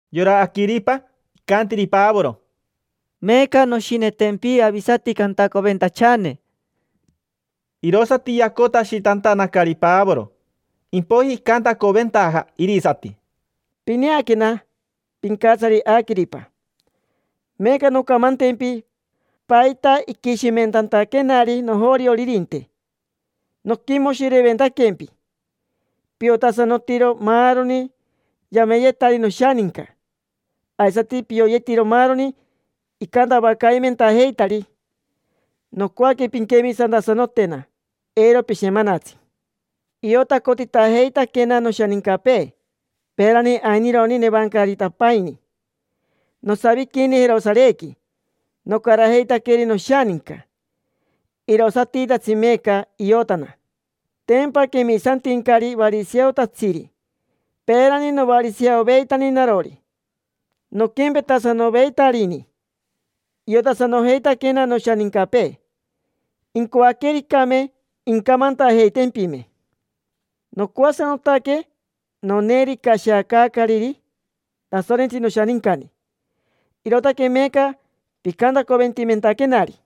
Yora Aquiripa icantiri Pavoro: —Meeca noshinetempi avisati cantacoventachane. Irosati yacotashitantanacari Pavoro, impoiji icantacoventaja irisati: —Pineaquena, pincatsari Aquiripa. Meeca noncamantempi paita iquishimentantaquenari nojorioririnte. Noquimoshireventaquempi, piotasanotiro maaroni yameyetari noshaninca, aisati pioyetiro maaroni icantavacaimentajeitari. Nocoaque pinquemisantasanotena, eiro pishemanatsi. Iotacotitajeitaquena noshanincapee, peerani ainironi nevancaritapaini. Nosaviquini Jerosarequi, nocarajeitaqueri noshaninca. Irosatitatsi meeca iotana. Tempa quemisantincari variseotatsiri. Peerani novariseoveitani narori, noquempetasanoveitarini. Iotasanojeitaquena noshanincapee, incoaquericame incamantajeitempime. Nocoasanotaque noneeri icashiacaacariri Tasorentsi noshanincani, irootaque meeca picantacoventimentaquenari.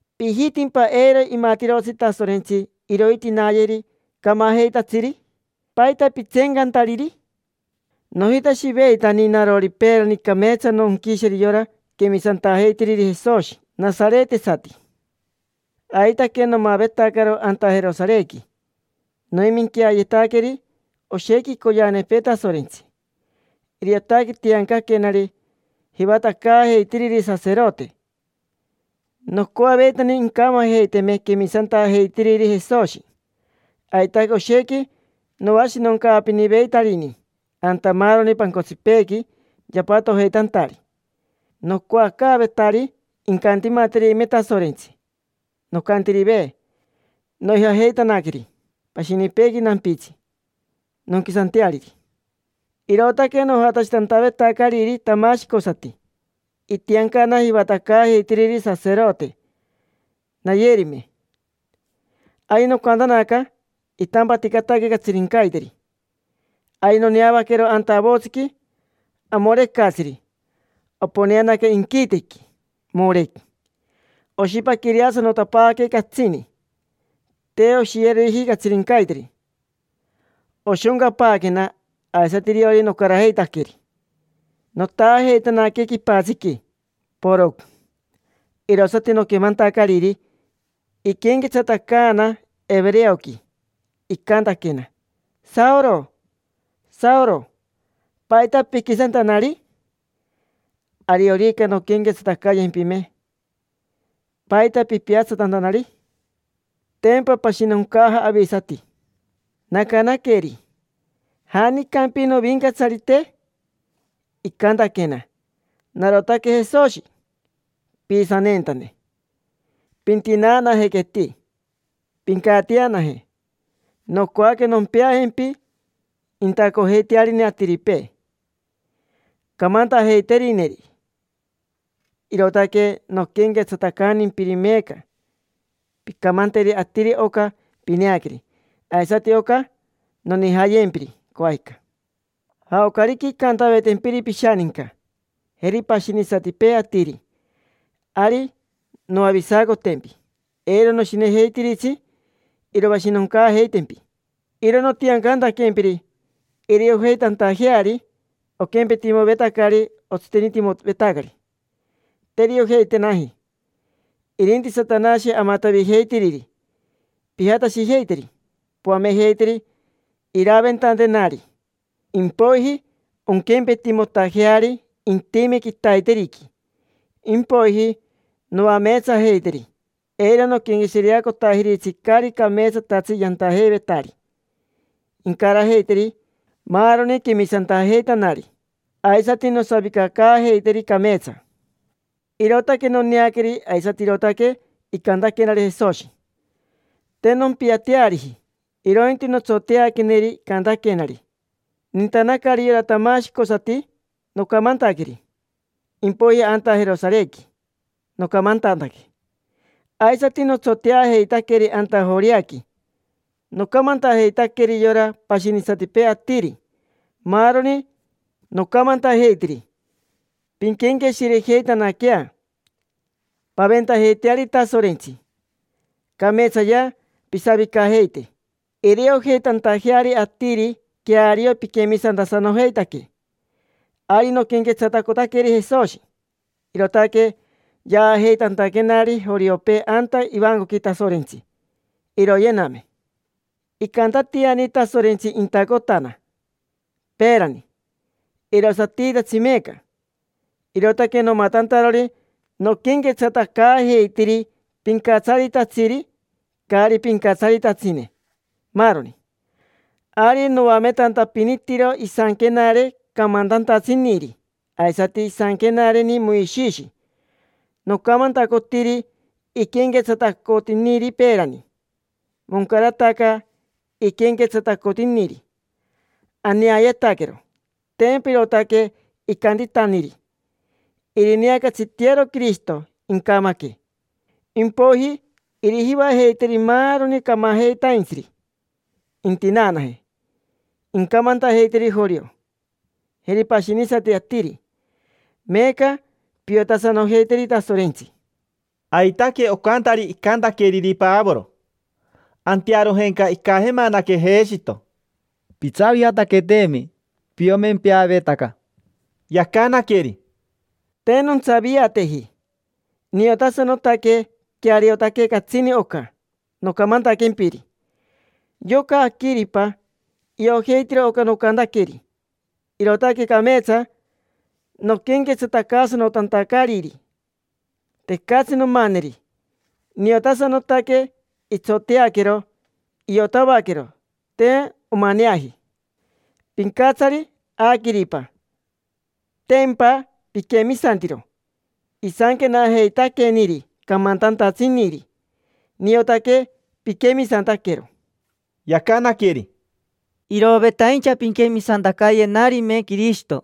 ¿Pijitimpa eiro imatirotsi Tasorentsi irointinayeri camajeitatsiri? ¿Paita pitseencantariri? Nojitashiveitani narori peerani cameetsa nonquisheri yora quemisantajeitiriri Jesoshi nasaretesati. Aitaque nomavetacaro anta Jerosarequi. Noiminqueayetaqueri oshequi icoyeanepee Tasorentsi. Iriotaque tiancaquenari jivatacaajeitiriri saserote. Nocoaveitani incamajeiteme quemisantajeitiriri Jesoshi. Aitaque oshequi noashinoncaapiniveitarini anta maaroni pancotsipeequi yapatojeitantari. Nocoacaavetari incantimaterime Tasorentsi. Nocaantirive, noijajeitanaqueri pashinipeequi nampitsi, nonquisanteariri. Irootaque nojatashitantavetacariri tamashicosati, itiancana jivatacaajeitiriri saserote nayerime. Ari nocaantanaca, itampaticataque catsirincaiteri. Ari noneavaquero anta avotsiqui amorecatsiri, oponeanaca inquitequi, morec. Oshipaquireasanotapaaque catsini, te oshiyeriji catsirincaiteri. Oshoncapaaquena, aisati iriori nocarajeitaqueri. Notaajeitanaque quipatsiqui, porocn. Irosati noquemantacariri, iquenquetsatacaana evereoqui. Icantaquena: “Saoro, Saoro. ¿Paita piquisantanari? Ariorica nonquenquetsatacayempime, ¿paita pipiatsatantanari? Tempa pashinoncaja avisati”. Nacanaqueri: “¿Janicampi, Novincatsarite?” Icantaquena: “Narotaque Jesoshi, piisaneentane. Pintinaanajequeti, pincatianaje. Nocoaque nompeajempi intacojeitearine atiripee, camantajeiterineri; irootaque noquenquetsatacantimpiri meeca. Pincamanteri atiri oca pineaqueri, aisati oca nonijayempiri, coajica. Jaocarica incantavetempiri pishaninca, jeri pashinisatipee atiri, ari noavisacotempi: eiro noshinejeitiritsi iroashinoncaajeitempi. Iro nontiancantaquempiri iriojeitantajeari. Oquempetimovetacari otsitenitimovetacari: te iriojeitenaji, irinti Satanashi amatavijeitiriri. Pijatashijeiteri, poamejeiteri iraventantenari, impoiji onquempetimotajeari intime quitaiteriqui. Impoiji noameetsajeiteri, eiro noquenqueshireacotajiritsi caari cameetsatatsi yantajeivetari; incarajeiteri maaroni quemisantajeitanari, aisati nosavicacaajeiteri cameetsa”. Irootaque noneaqueri aisati irootaque icantaquenari Jesoshi. Te nompiateariji, irointi notsoteaqueneri icantaquenari. Nintanacari yora tamashicosati, nocamantaqueri. Impoiji anta Jerosarequi nocamantantaque. Aisati notsoteajeitaqueri anta Joreaqui. Nocamantajeitaqueri yora pashinisatipee atiri, maaroni. Nocamantajeitiri: “Pinquenqueshirejeitanaquea, paventajeiteari Tasorentsi. Cameetsayea pisavicajeite, iriojeitantajeari atiri queario piquemisantasanojeitaque”. Ari noquenquetsatacotaqueri Jesoshi, irootaque yaajeitantaquenari joriopee anta ivancoqui Tasorentsi, iroyename. Icantatiani Tasorentsi intacotana: peerani, irosatitatsi meeca. Irootaque nomatantarori noquenquetsatacaajeitiri pincatsaritatsiri, caari pincatsaritatsine, maaroni. Ari noametantapinitiro isanquenare camantantatsiniri, aisati isanquenareni Moishishi. Nocamantacotiri iquenquetsatacotiniri peerani: moncarataca iquenquetsatacotiniri, aneayetaquero. Tempa irootaque icantitaniri: “Irineacatsitearo Quirishito, incamaque. Impoiji irijivajeiteri maaroni camajeitaintsiri, intinaanaje. Incamantajeiteri jorio, jeri pashinisati atiri: ‘Meeca piotasanojeiteri Tasorentsi’”. Aitaque ocantari icantaqueriri Pavoro. Antearojenca icajemanaque Jeshito: —Pitsaviataqueteemi, piomempeavetaca. Yacanaqueri: —Te nontsaviateji, niotasanotaque. Queariotaque catsini oca nocamantaquempiri. Yoca Aquiripa iojeitiro oca nocantaqueri, irootaque cameetsa noquenquetsatacaasanotantacariri. Tecatsi nomaneri, niotasanotaque itsoteaquero, iotavaquero; te omaneaji. Pincatsari Aquiripa: tempa piquemisantiro isanquenajeitaqueniri camantantatsiniri. Niotaque piquemisantaquero. Yacanaqueri: —Irovetaincha pinquemisantacayenarime Quirishito.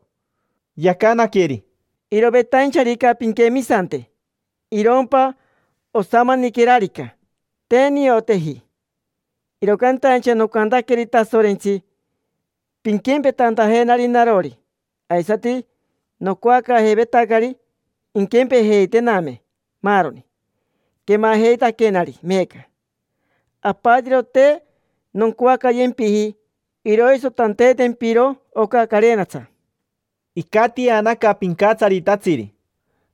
Yacanaqueri: —Irovetaincharica pinquemisante, irompa osamaniquerarica, te nioteji. Iro cantaincha nocantaqueri Tasorentsi pinquempetantajenari narori. Aisati nocoacaajeivetacari inquempejeitename maaroni quemajeitaquenari meeca: apatiro te noncoacayempiji iroisotanteetempiro oca carenatsa. Icatianaca pincatsaritatsiri: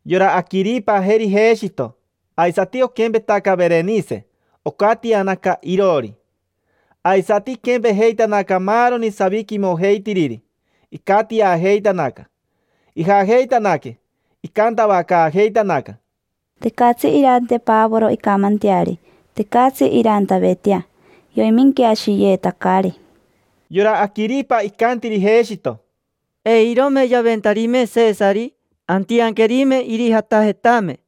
yora Aquiripa, jeri Jeshito, aisati oquempetaca Verenise, ocatianaca iroori. Aisati iquempejeitanaca maaroni saviquimojeitiriri, icatiajeitanaca. Ijajeitanaque, icantavacaajeitanaca: —Tecatsi irante Pavoro incamanteari. Tecatsi irantavetea, yoiminqueashiyeetacari. Yora Aquiripa icantiri Jeshito: —Eirome yaventarime Sesari, antianquerime irijatajetame.